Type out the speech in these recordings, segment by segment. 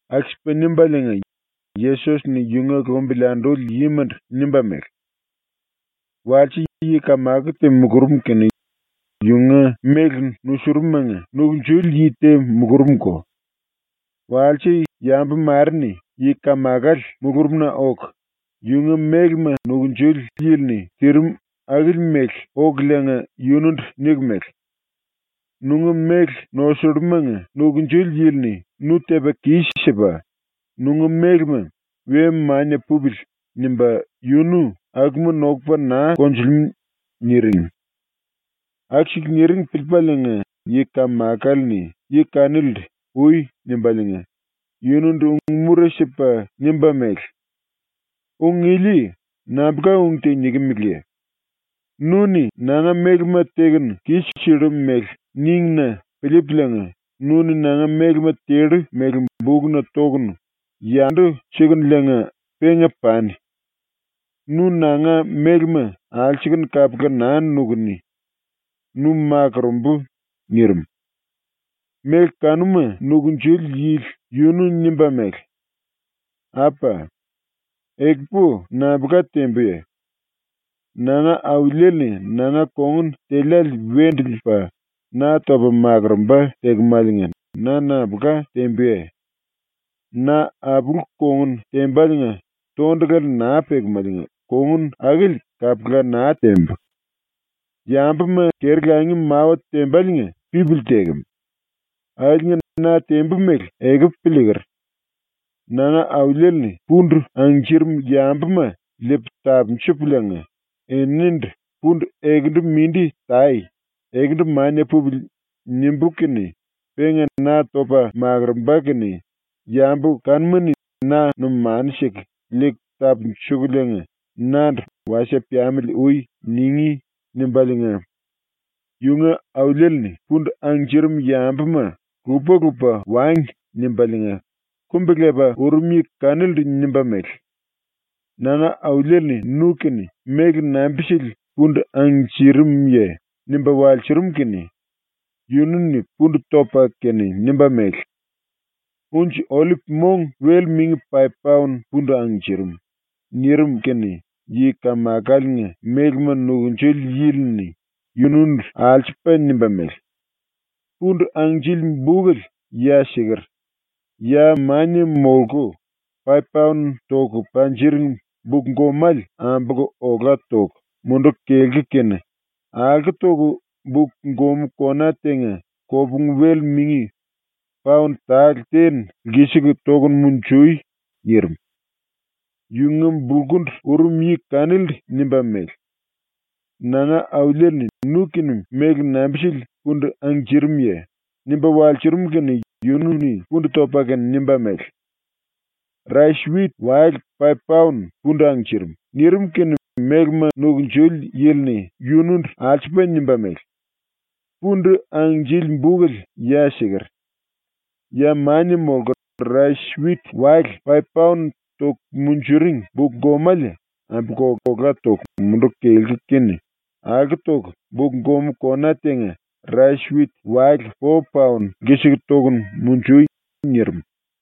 ⸤Aku-sipa nimbaliinga⸥ Yesos-ni yunga lumbili anduli yimandu nimba mele: “Walse yi-kamako te mulurum kene yunga méle nusurum-manga nukunjuli yi te mulurumko. Walse yambu mare-ni yi-kamakale mulurumna oku, yunga mélema nukunjuli yili-ni tirim akili mele okuliinga yunundu niku mele: “Nunga méle nosullumanga nukunjuli yili-ni nu tepa kis-sipa, nunga mélema ‘We mania pupili.’ nimba yunu akuma nokupa naa konjulimú.” niring. Aku-siku niring piliipaliinga yi-kamakale-ni yi kanilindu ‘Ui.’ nimbaliinga yunundu ung-mura sipa nimba mele: “Ung ili nambulka ung te nikimeleye? Nu-ni nanga mélema tekunu kis-sillu mele níngi-na piliipuliinga nu-ni nanga mélema tellu mele bukna tokunu, yandu sikuliinga penga pani. Nu nanga mélema alsukunu kapula naa nukuni. Nu makurumbu.” nirim. Méle kanuma nukunjuli yili yunu nimba mele: “Apa! Ekupu nambulka tembuye? Nanga auliele-ni nanga kongun teliále wendu liipa na topa makurumba tekemaliinga na nambulka tembuye? Na apulu-kongun tembaliinga tondulale naa pelemáliinga kongun akili kapula naa tembu. Yambuma keri-langi mawa tembaliinga pipili tekem. Akiliinga na tembu mele ekupu piliiker. ⸤Nanga auliele-ni pundu angnjirim yambuma liipu tapunjupuliinga eninindu ‘Pundu ekendu mindi tai, ekendu mania pupili.’ nimbú kene⸥ penga na topa makurumba kene yambu kanuma-ni na numanu siku liiku tapunjukuliinga nandu “Wasie piamili ui.” ningí.” nimbaliinga, Yunga auliele-ni pundu angnjirim yambuma ‘Lupa-lupa wangi.’ nimbaliinga kumbi-lepa urum yi kanilindu nimba mele: “Nanga auliele-ni nu-kene méle nambi-sili pundu angnjirimuye?” nimba walsurum kene yunu-ni pundu topa kene nimba mele: “Unji-ollip mong wel-mingi paip-paon pundu angnjirim.” nirim kene yi-kamakaliinga mélema nukunjuli yili-ni yunundu alsupa nimba mele: “Pundu angnjili bukele ya siker; ya mania molku, paip-paon toku panjiring buk-gomale ambolku ola toku munduku kelku kene alko toku buk-gomú kona tenga kopungu-wel mingi paon tale ten lkisiku tokunu munjui.” nirim. Yunga bulkundu urum yi kanilindu nimba mele: “Nanga auliele-ni nu-kene méle nambi-sili pundu angnjirimuye?” nimba walsurum kene yunu-ni pundu topa kene nimba mele: “Rais-wit wale paip-paon pundu angnjirim.” nirim kene mélema nukunjuli yili-ni yunundu alsupa nimba mele: “Pundu angnjili bukele ya siker; ya mania molku, rais-wit wale paip-paon toku munjuring buk-gomale ambolku ola toku munduku kelku kene alko toku buk-gomú kona tenga rais-wit wale po-paon lkisiku tokunu munjui.” nirim.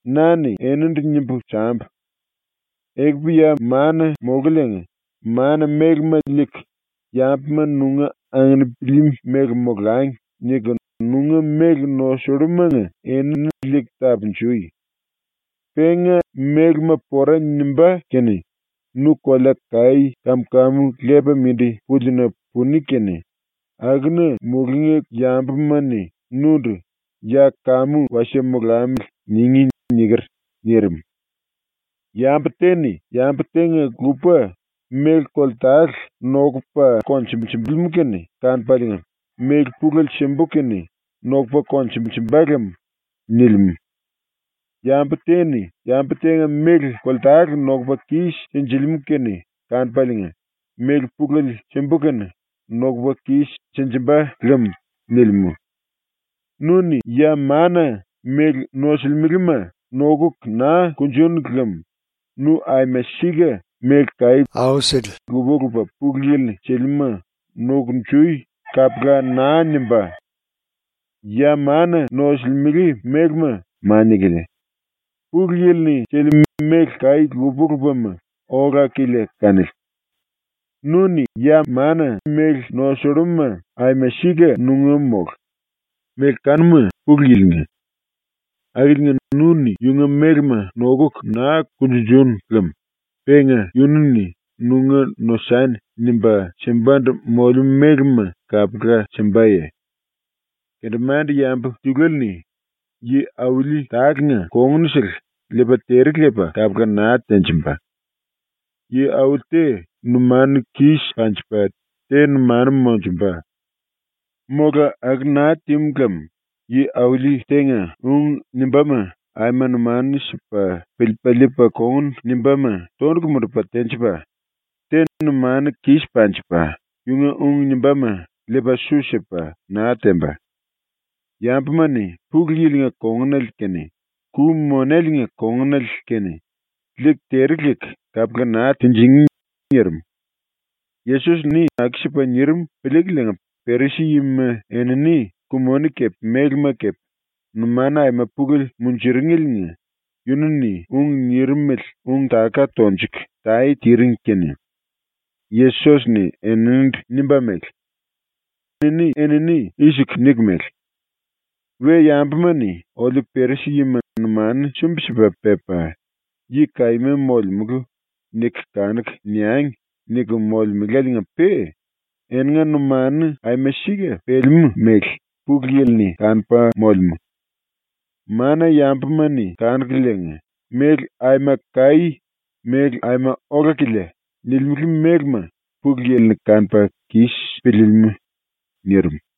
“Na-ni enindu nimbu sambu: “Ekupu ya mana-molkuliinga mana-mélema liiku ‘Yambuma nunga anginpili mele molangi.’ niku nunga méle nosullumanga enini liiku tapunjui. Penga mélema pora nimbá kene nu kolea-kaí kam-kamu lepa mindi púlina puni kene akuna mulungí yambuma-ni nundu “Ya kamu wasie molamili.” ningí.” niker.” ⸤nirim.⸥ “Yambu te-ni yambu tenga-lupa méle koltale nokupa konjunjulimú kene kanupaliinga ‘Méle pulele simbu kene nokupa konjunjumba lem.’ nilimú. Yambu te-ni yambu tenga méle koltale nokupa kis-sinjilimú kene kanupaliinga “Méle pulele simbu kene nokupa kis-sinjimba lem.” nilimú. Nu-ni ya mana méle nosulimelema nokuku naa kunjunu lem nu aima sika méle kaí lupa-lupa Pulu Yili-ni silimúma ‘Nokunjui.’ kapula naa nimbá. ⸤Ya mana nosulimele mélema mania-kilia, Pulu Yili-ni silimú méle kaí lupa-lupama ola-kilia kanili.⸥ Nu-ni ya mana mania méle nosulluma aima sika nunga mólu, méle kanuma Pulu Yili-nga. Akiliinga nu-ni yunga mélema nokuku naa kunjunjunu lem penga yunu-ni ‘nunga nosani.’ nimba simbandu molemú mélema kapula simbaye? “Kendemande-yambu tiluele-ni yi-auli tálenga kongunsele liipa tere lepa kapula naa tenjimba. Yi-auli te numanu kis panjipa, te numanu monjumba. Mola aku naa tímu lem yi-auli tenga ung nimbáma aima numanu sipa piliipa liipa kongun nimbáma tondulu mundupa tenjipa, te numanu kis panjipa yunga ung nimbáma liipa su sipa naa temba. Yambuma-ni Pulu Yili-nga kongunale kene Ku-Monelenga kongunale kene liiku tere leku kapula naa tinjingí.” nirim. Yesos-ni aku-sipa nirim piliikuliinga Perisi-yima enini ku-moni kepe mélema kepe numanu aima pulele munjuringeliinga yunu-ni ung nirimele ung-taka tonjuku tae tiring kene Yesos-ni eninindu nimba mele: “Eni-enini i-siku niku mele: ‘We-yambuma-ni oliu Perisi-yima numanu sumbi-sipa pepa, yi kaíma molemulu niku kanuku niangi.’ niku molemeláliinga-pe eninga numanuna aima sika pelemú mele Pulu Yili-ni kanupa molemú. Mana-yambuma-ni kanukuliinga ‘Méle aima kaí, méle aima ola-kilia.’ nilimele mélema Pulu Yili-ni kanupa kis piliilimú.” ⸤nirim.⸥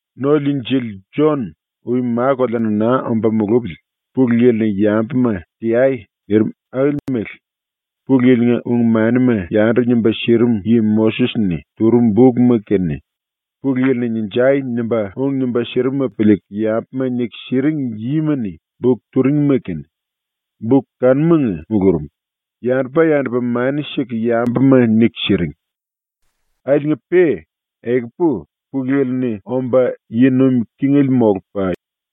“⸤No-Liinjili⸥ Jon ui ma-koleana naa omba mulupili Pulu Yili-ni yambuma ‘Teai.’ nirim akili mele ⸤Pulu Yili-nga ung-manima yandu nimba sirim yi⸥ Moses-ni turum bukma kene, Pulu Yili-ni “Ninjai!” nimba ung nimba sirimuma piliiku yambuma niku siring yima-ni buk turingima kene, buk kanumanga mulurum, yandupa-yandupa mani siku yambuma niku siring. Akiliinga-pe, ekupu, Pulu Yili-ni omba yi nuim kingele molupa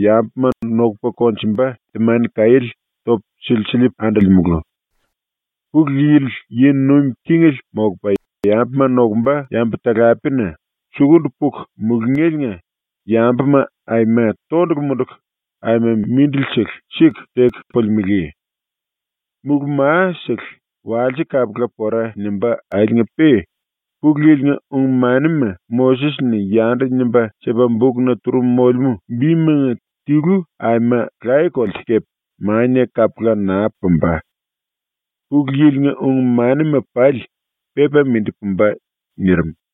yambuma nokupa konjumba temani-kaiéle topu silsiliipu andolemulu. Pulu Yili yi nuim kingele molupa yambuma nokumba yambu-talapena sukundu puku mulungéliinga yambuma aima tondulu munduku aima mindilisele siku teku pulimelé. Mulú-ma-sele walse kapula pora nimbá akiliinga-pe Pulu Yili-nga ung-manima Moses-ni yandu nimba sipa bukna turum molemú bimanga tilu aima laye-kolte kepe mania kapula naa pumba. Pulu Yili-nga ung-manima pali pepa mindi pumba.” ⸤nirim.⸥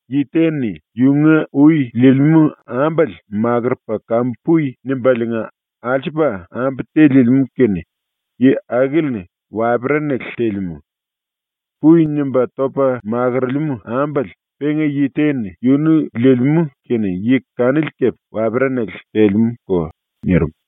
“Yi te-ni yunga ui liilimú ambale makurupa “Kamu pui.” nimbaliinga alsupa ambu te liilimú kene yi akili-ni waperanale telemú. “Pui.” nimba topa makorolemú ambale penga yi te-ni yunu liilimú kene yi kanili kepe waperanale telemúko.” ⸤nirim.⸥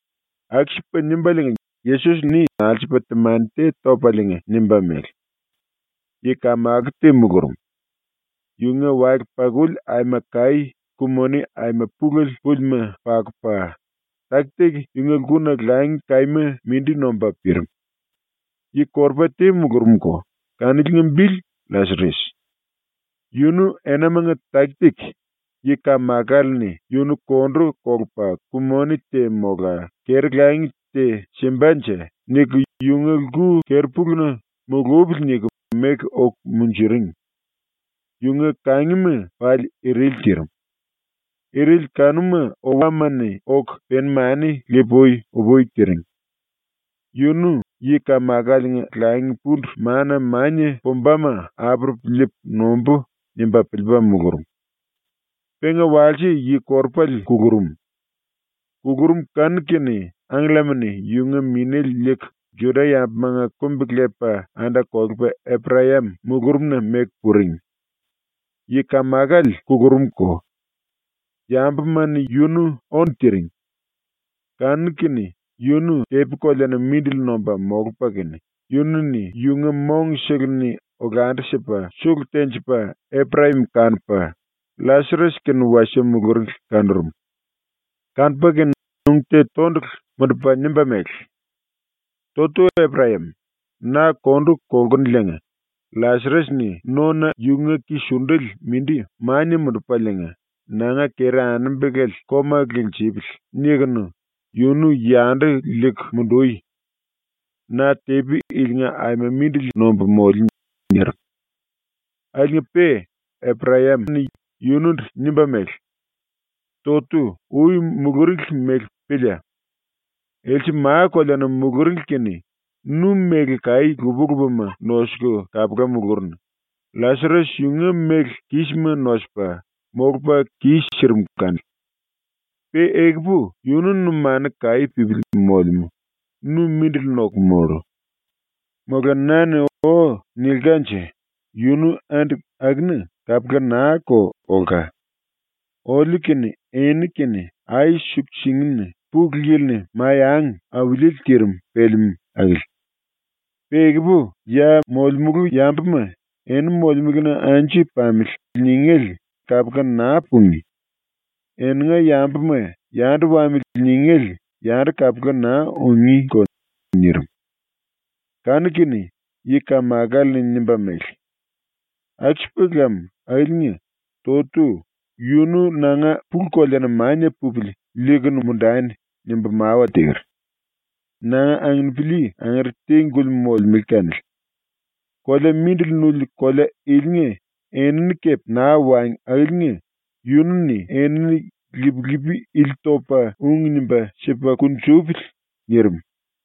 ⸤Aku-sipa nimbaliinga Yesos-ni alsupa temani te topaliinga nimba mele:⸥ “Yi-kamako te mulurum. Yunga wale-pakuli aima kaí ku-moni aima pulele púlima pakupa, taki-taki yunga lkuna langi kaíma mindi nomba pirim. Yi-korupa te mulurumko, kaniliinga bili LLasares. Yunu enamanga taki-taki ‘Yi-kamakale-ni yunu kondu kolupa ku-moni te mola keri-langi te simbanje.’ niku yunga lku keri-puluna ‘Mulupili.’ niku meku oku munjuring. Yunga kangima pali irili tirim. Irili kanuma owama-ni oku peni-mani le-pui-upui tiring. Yunu ‘Yi-kamakaliinga langi-pundu mana mania pumbama apurupu liipu nombú.’ nimba piliipa mulurum. Penga walse yi-korupale kulurum. Kulurum kanu-kene angkellama-ni yunga minéle liiku, ⸤Juda-yambumanga kumbi-lepa anda-kolepa⸥ Eprayam mulurumna meku puring. Yi-kamakale kulurumko. Yambuma-ni yunu ónu tiring. Kanu-kene yunu tepi-koleana mindili nomba molupa kene, yunu-ni yunga mongsele-ni olandu-sipa sulu tenjipa Eprayam kanupa, LLasares kene wasie muluringli kanurum. Kanupa kene ung te tondulu mundupa nimba mele: “Totu Eprayam, na kondu kolkunuliinga ‘LLasares-ni nona yunga ki-sundele mindi mania mundupaliinga ‘Nanga keri-anembelale koma linjipili.’ nimba tinjipili.’ nikunu yunu yandu liiku mundui. Na tepi ilinga aima mindili nombu moliu.” nirim. Akiliinga-pe Eprayam-ni yunundu nimba mele: “Totu, ui muluringli mele pília! Else ma-koleana muluringli kene nu méle kaí lupa-lupama nosuku kapula mulurunu; LLasares yunga méle kísima nosupa, molupa kis-sirim kanili. Pe ekupu yunu numanu kaí pípili molemú, nu mindili noku mollu. Mola na-ni “O.” nilkanje yunu andi akuna kapula naa-ko olka. Oliu kene eni kene ai-suku-singina ⸤Pulu Yili-ni⸥ mai-angi auliele tirim pelemú akili. Pe ekupu ya molemulu yambuma ‘Eni molemelena anju pamili.’ ningéle kapula naa pungí; eninga yambuma ‘Yandu wamili.’ ningéle yandu kapula naa ungíko.” nirim. Kanu-kene yi-kamakale-ni nimba mele: “Aku-sipa lam akiliinga, Totu, yunu nanga pulu-koleana mania pupili liikunu mundani nimbu mawa teker. Nanga anginipili angere te-guli molemele kanili. Kolea mindili nuli kolea ilinga enini kepe naa wangi akiliinga yunu-ni enini lip-lipi ili topa ung nimba sipa kunjupili.” nirim.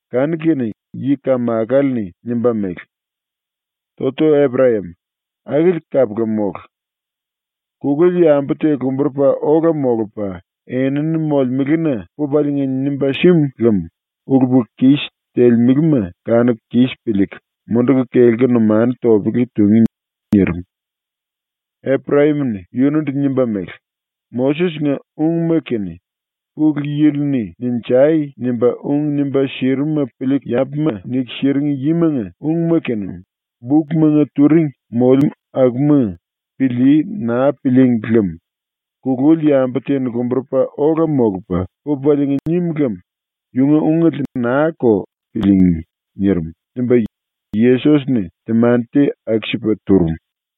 Kanu-kene yi-kamakale-ni nimba mele: “Totu Eprayam, akili kapula mólu. Kululi yambu te lomburupa ola molupa enini molemelena pupaliinga nimba símu lem ulu-pulu-kis telemelema kanuku kis piliiku munduku kelku numanu topele tungí.” nirim. Eprayam-ni yunundu nimba mele: “Moses-nga ungma kene Pulu Yili-ni “Ninjai!” nimba ung nimba sirimuma piliiku yambuma niku siring yimanga ungma kene ⸤bukmanga turing molemú akuma⸥ pilíí naa pilííngi lem kululi yambu te lomburupa ola molupa pupaliinga nim lem yunga ungele naa-ko piliingí.” nirim.” nimba Yesos-ni temani te aku-sipa turum.